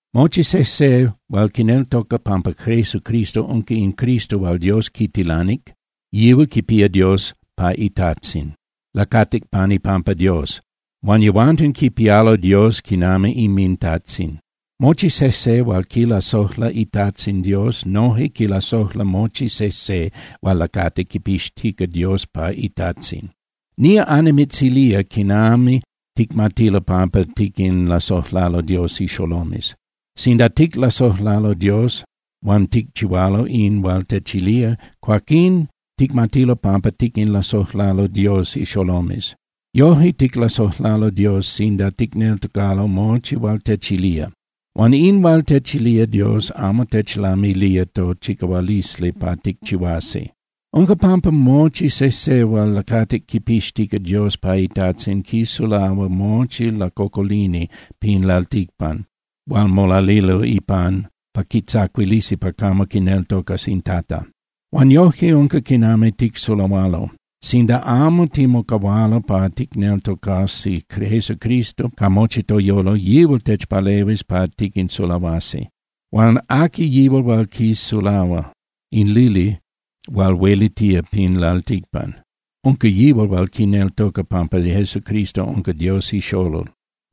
Mochi sejse hual quineltoca pampa Jesucristo unca in Cristo hual Dios quitilanic, yihual quipía Dios pa iTajtzin. Lacatic pan ipampa Dios. Huan yehuanten quipialo Dios quinami inminTajtzin. Mochi sejse hual quilasojla iTajtzin Dios noje quilasojla mochi sejse hual lacati quipixtica Dios pa iTajtzin. Nía annimitzilía quinami ticmatilo pampa tiquinlasojlalo Dios ixolomes. Sinda ticlasojlalo Dios huan ticchihualo in hual techilía, cuaquín ticmatilo pampa tiquinlasojlalo Dios ixolomes. Yojque ticlasojlalo Dios sinda ticneltocalo mochi hual techilía. Huan in hual techilía Dios amo techlamilía tochicahualisli pa ticchihuasi. Unca pampa mochi sejse hual lacatic quipixtica Dios pa iTajtzin quisulahua mochi lacocolini pin lalticpan hual molalilo ipan pa quitzacuilisi pa camo quineltocas in Tata. Huan yojque unca quinami ticsulahualo: Sinda amo timocahualo pa ticneltocasi Jesucristo ca mochi toyolo, yihual techpalehuis pa tiquinsulahuasi. Huan ¿aqui yihual hual quisulahua in lili hual huelitía pin lalticpan? Unca yihual hual quineltoca pampa Jesucristo unca Dios iXolol.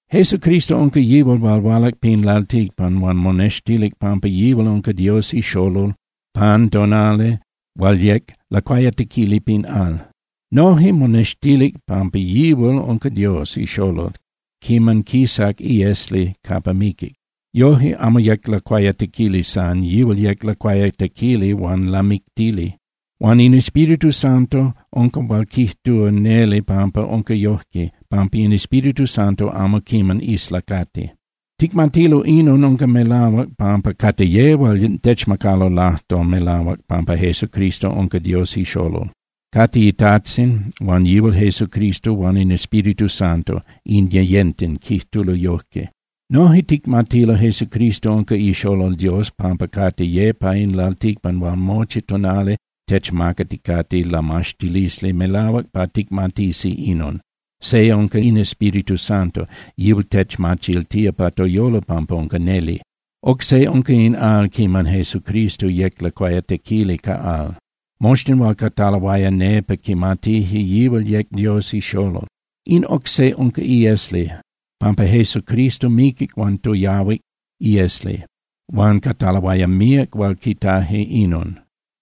Jesucristo unca yihual hual hualac pin lalticpan huan monextilic pampa yihual unca Dios iXolol pan tonali hual yec lacuayatequili pin al. Noje monextilic pampa yihual unca Dios iXolol quiman quisac iesli capa miquic. Yojque amo yec lacuayatequili san, yihual yec lacuayatequili huan lamictili. Huan in Espíritu Santo unca hual quijtúa neli pampa unca yojque, pampa in Espíritu Santo amo quiman islacati. Ticmatilo inon unca melahuac pampa cate ye hual techmacalo lajtol melahuac pampa Jesucristo unca Dios iXolol, cate iTajtzin huan yihual Jesucristo huan in Espíritu Santo, in yeyenten quijtulo yojque. Noje ticmatilo Jesucristo unca iXolol Dios pampa cate ye pa in lalticpan hual mochi tonali techmacaticate lamaxtilisli melahuac pa ticmatisi inon. Se unca in Espíritu Santo. Yihual techmachiltía pa toyolo pampa unca neli. Oc se unca in al quiman Jesucristo yec lacuayatequili ca al, moxtin hual cataloaya nepa quimatije yihual yec Dios iXolol. In oc se unca iesli, pampa Cristo miquic huan toyahuic iesli, huan cataloaya míac hual quitaje inon.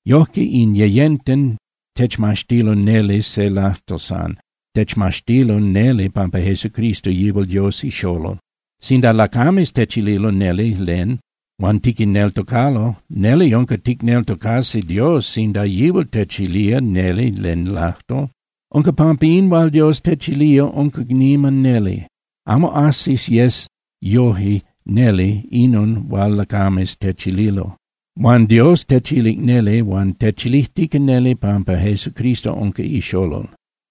Yojque in yeyenten techmaxtilo neli se lajtol san, techmaxtilo neli pampa Jesucristo yihual Dios iXolol. Sinda lacames techililo neli len, huan tiquinneltocalo, neli unca ticneltocasi Dios sinda yihual techilía neli len lajtol. Unca pampa in hual Dios techilía unca niman neli. Amo ajsis yes yoje neli inon hual lacames techililo. Huan Dios techilic neli huan techilijtica neli pampa Jesucristo unca iXolol.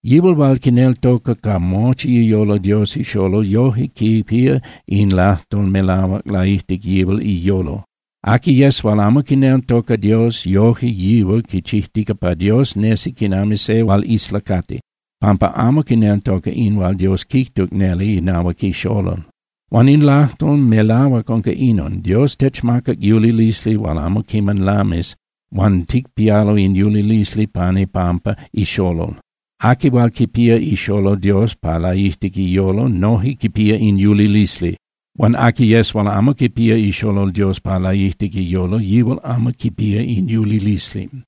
Yihual hual quineltoca ca mochi iyolo Dios iXolol yoje quipía in lajtol melahuac laijtic yihual iyolo. Aqui yes hual amo quineltoca Dios, yoje yihual quichijtica pa Dios nesi quinami se hual islacati, pampa amo quineltoca in hual Dios quijtuc neli inahuac iXolol. Huan in lajtol melahuac unca inon: Dios techmacac yulilisli hual amo quiman lamis huan ticpialo in yulilisli pan ipampa iXolol. Aqui hual quipía iXolol Dios pa laijtic iyolo noje quipía in yulilisli. Huan aqui yes hual amo quipía iXolol Dios pa laijtic iyolo yihual amo quipía in yulilisli.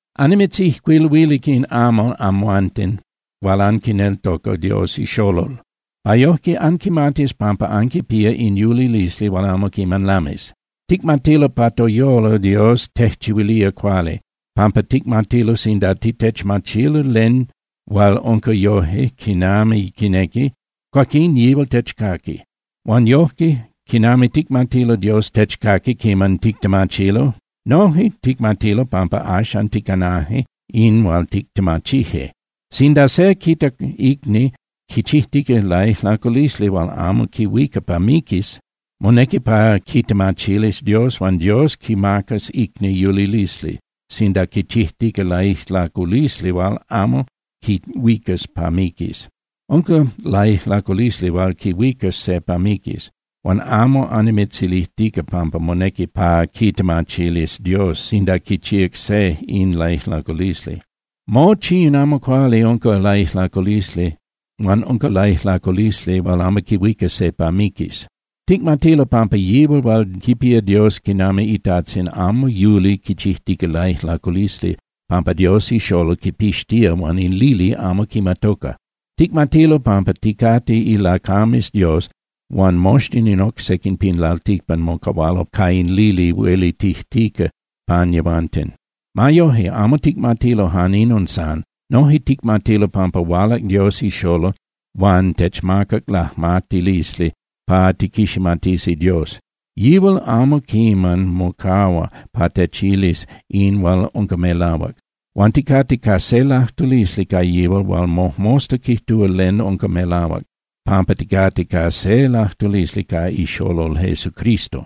Annimitzijcuiluilic in amal amhuanten hual anquineltoca Dios iXolol pa yojque anquimatis pampa anquipía in yulilisli hual amo quiman lamis. Ticmatilo pa toyolo Dios tejchihuilía cuali, pampa ticmatilo sinda tictemachilo len hual unca yoje quinami quinequi, cuaquín yihual techcaqui. Huan yojque, quinami ticmatilo Dios techcaqui quiman tictemachilo, noje ticmatilo pampa axan ticanaje in hual tictemachije. Sinda se quita icni quichijtica laijlaculisli hual amo quihuica pa miquis, monequi pa quitemachilis Dios huan Dios quimacas icni yulilisli, sinda quichijtica laijlaculisli hual amo quihuicas pa miquis. Unca laijlaculisli hual quihuicas se pa miquis, huan amo annimitzilijtica pampa monequi pa quitemachilis Dios sinda quichíac se in laijlaculisli. Mochi in amo cuali unca laijlaculisli huan unca laijlaculisli hual amo quihuica se pa miquis. Ticmatilo pampa yihual hual quipía Dios quinami iTajtzin amo yuli quichijtica laijlaculisli, pampa Dios iXolol quipixtía huan in lili amo quimatoca. Ticmatilo pampa ticate ilacames Dios huan moxtin in oc sequin pin lalticpan mocahualo ca in lili huelitijtica pan yehuanten. Ma yoje, amo ticmatilo jan inon san. Noje ticmatilo pampa hualac Dios iXolol, huan techmacac lajmatilisli pa tiquiximatisi Dios. Yihual amo quiman mocahua pa techilis in hual unca melahuac. Huan ticate ca se lajtulisli ca yihual hual mojmosta quijtúa len unca melahuac, pampa ticate ca se lajtulisli ca iXolol Jesucristo.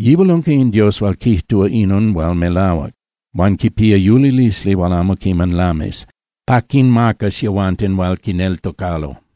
Yihual unca in Dios hual quijtúa inon hual melahuac huan quipía yulilisli hual amo quiman lamis pa quinmacas yehuanten hual quineltocalo.